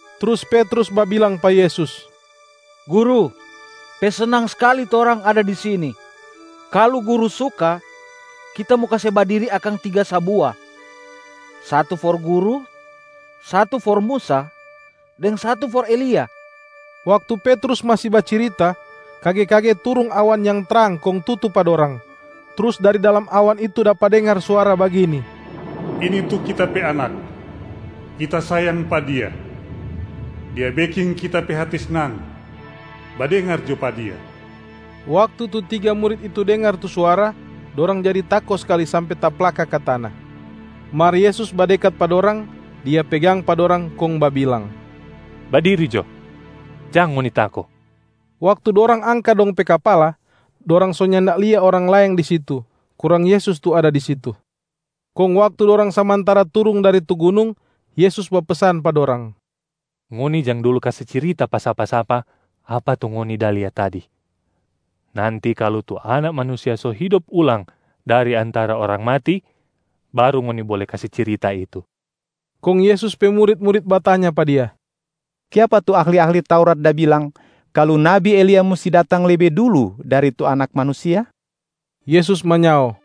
Trus Petrus babilang pa Yesus, “Guru, pe snang skali torang ada di sini. Kalu Guru suka, kita mo kase badiri akang tiga sabua: satu for Guru, satu for Musa, deng satu for Elia.” Waktu Petrus masi bacirita, kage-kage turung awan yang trang kong tutu pa dorang. Trus dari dalam awan itu dapa dengar suara bagini, “Ini tu Kita pe Anak, Kita sayang pa Dia. Dia beking Kita pe hati snang. Badengar jo pa Dia!” Waktu tu tiga murit itu dengar tu suara, dorang jadi tako skali sampe taplaka ka tana. Mar Yesus badekat pa dorang, Dia pegang pa dorang kong babilang, “Badiri jo, jang ngoni tako!” Waktu dorang angka dong pe kapala, dorang so nyanda lia orang laeng di situ, kurang Yesus tu ada di situ. Kong waktu dorang samantara turung dari tu gunung, Yesus bapesan pa dorang, “Ngoni jang dulu kase cirita pa sapa-sapa apa tu ngoni da lia tadi! Nanti kalu tu Anak Manusia so hidop ulang dari antara orang mati baru ngoni bole kase cirita itu.” Kong Yesus pe murit-murit batanya pa Dia, “Kiapa tu ahli-ahli Taurat da bilang kalu nabi Elia musti datang lebe dulu dari tu Anak Manusia?” Yesus manyao,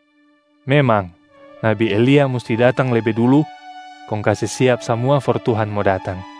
“Memang, nabi Elia musti datang lebe dulu kong kase siap samua for Tuhan mo datang.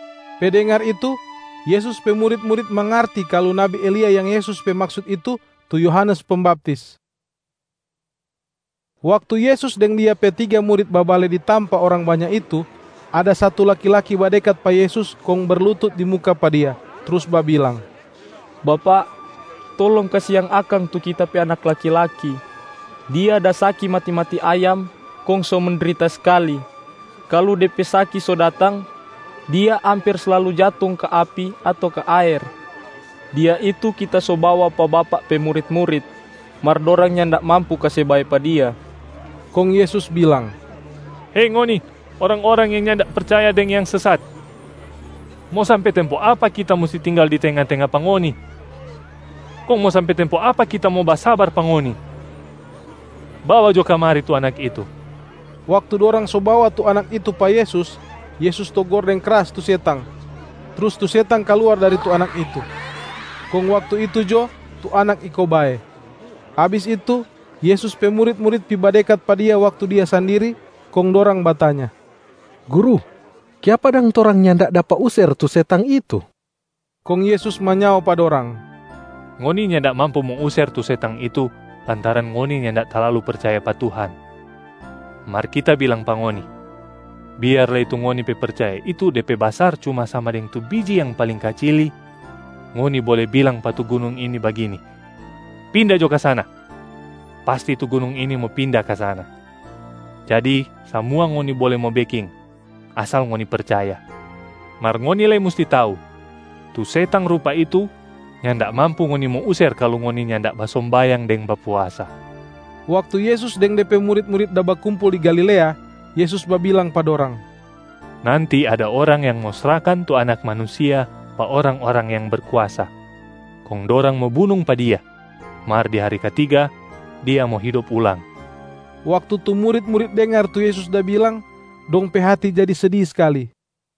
Pe dengar itu, Yesus pe murit-murit mangarti kalu nabi Elia yang Yesus pe maksut itu, tu Yohanes Pembaptis. Waktu Yesus deng Dia pe tiga murit babale di tampa orang banya itu, ada satu laki-laki badekat pa Yesus kong berlutut di muka pa Dia, trus babilang, “Bapak, tolong kasiang akang tu kita pe anak laki-laki! Dia da saki mati-mati ayam kong so mendrita skali. Kalu de pe saki so datang, dia amper slalu jatung ka api ato ka aer. Dia itu kita so bawa pa Bapak pe murit-murit, mar dorang nyanda mampu kase bae pa dia.” Kong Yesus bilang, “Hei ngoni orang-orang yang nyanda percaya deng yang sesat! Mo sampe tempo apa Kita musti tinggal di tenga-tenga pa ngoni? Kong mo sampe tempo apa Kita mo basabar pa ngoni? Bawa jo kamari tu anak itu!” Waktu dorang so bawa tu anak itu pa Yesus, Yesus togor deng kras tu setang, trus tu setang kaluar dari tu anak itu. Kong waktu itu jo, tu anak iko bae. Abis itu, Yesus pe murit-murit pi badekat pa Dia waktu Dia sandiri, kong dorang batanya, “Guru, kiapa dang torang nyanda dapa user tu setang itu?” Kong Yesus manyao pa dorang, “Ngoni nyanda mampu mo user tu setang itu lantaran ngoni nyanda talalu percaya pa Tuhan. Mar Kita bilang pa ngoni, biar lei tu ngoni pe percaya itu de pe basar cuma sama deng tu biji yang paling kacili, ngoni bole bilang pa tu gunung ini bagini, ‘Pinda jo ka sana!’ pasti tu gunung ini mo pinda ka sana. Jadi samua ngoni bole mo beking, asal ngoni percaya. [ Mar ngoni lei musti tau, tu setang rupa itu nyanda mampu ngoni mo user kalu ngoni nyanda basombayang deng bapuasa.]” Waktu Yesus deng De pe murit-murit da bakumpul di Galilea, Yesus babilang pa dorang, “Nanti ada orang yang mo srahkan tu Anak Manusia pa orang-orang yang berkuasa. Kong dorang mo bunung pa Dia, mar di hari katiga Dia mo hidop ulang.” Waktu tu murit-murit dengar tu Yesus da bilang, dong pe hati jadi sedi skali.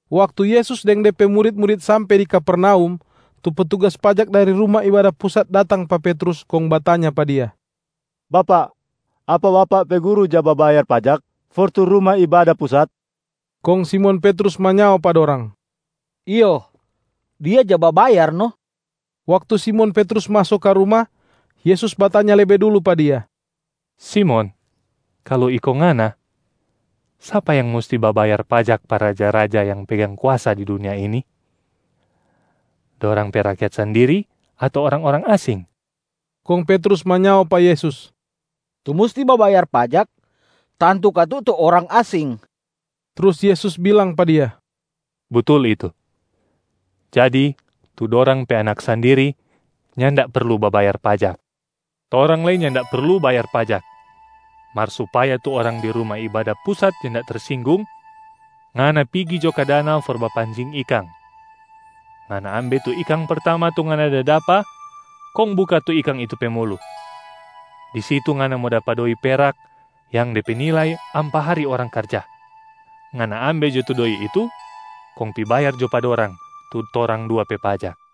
Waktu Yesus deng De pe murit-murit sampe di Kapernaum, tu petugas pajak dari Ruma Ibada Pusat datang pa Petrus kong batanya pa dia, “Bapak, apa bapak pe Guru ja babayar pajak for tu Ruma Ibada Pusat?” Kong Simon Petrus manyao pa dorang, “Iyo, Dia ja babayar no.” Waktu Simon Petrus maso ka ruma, Yesus batanya lebe dulu pa dia, “Simon, kalu iko ngana, sapa yang musti babayar pajak pa raja-raja yang pegang kuasa di dunia ini? Dorang pe rakyat sandiri ato orang-orang asing?” Kong Petrus manyao pa Yesus, “Tu musti babayar pajak, tantu katu tu orang asing.” Trus Yesus bilang pa dia, “Butul itu. Jadi tu dorang pe anak sandiri nyanda perlu babayar pajak. Torang lei nyanda perlu bayar pajak, mar supaya tu orang di Ruma Ibada Pusat nyanda tersinggung, ngana pigi jo ka danau for bapancing ikang. Ngana ambe tu ikang pertama tu ngana da dapa, kong buka tu ikang itu pe mulu. Di situ ngana mo dapa doi perak yang de pe nilai ampa hari orang karja. Ngana ambe jo tu doi itu kong pi bayar jo pa dorang tu torang dua pe pajak.”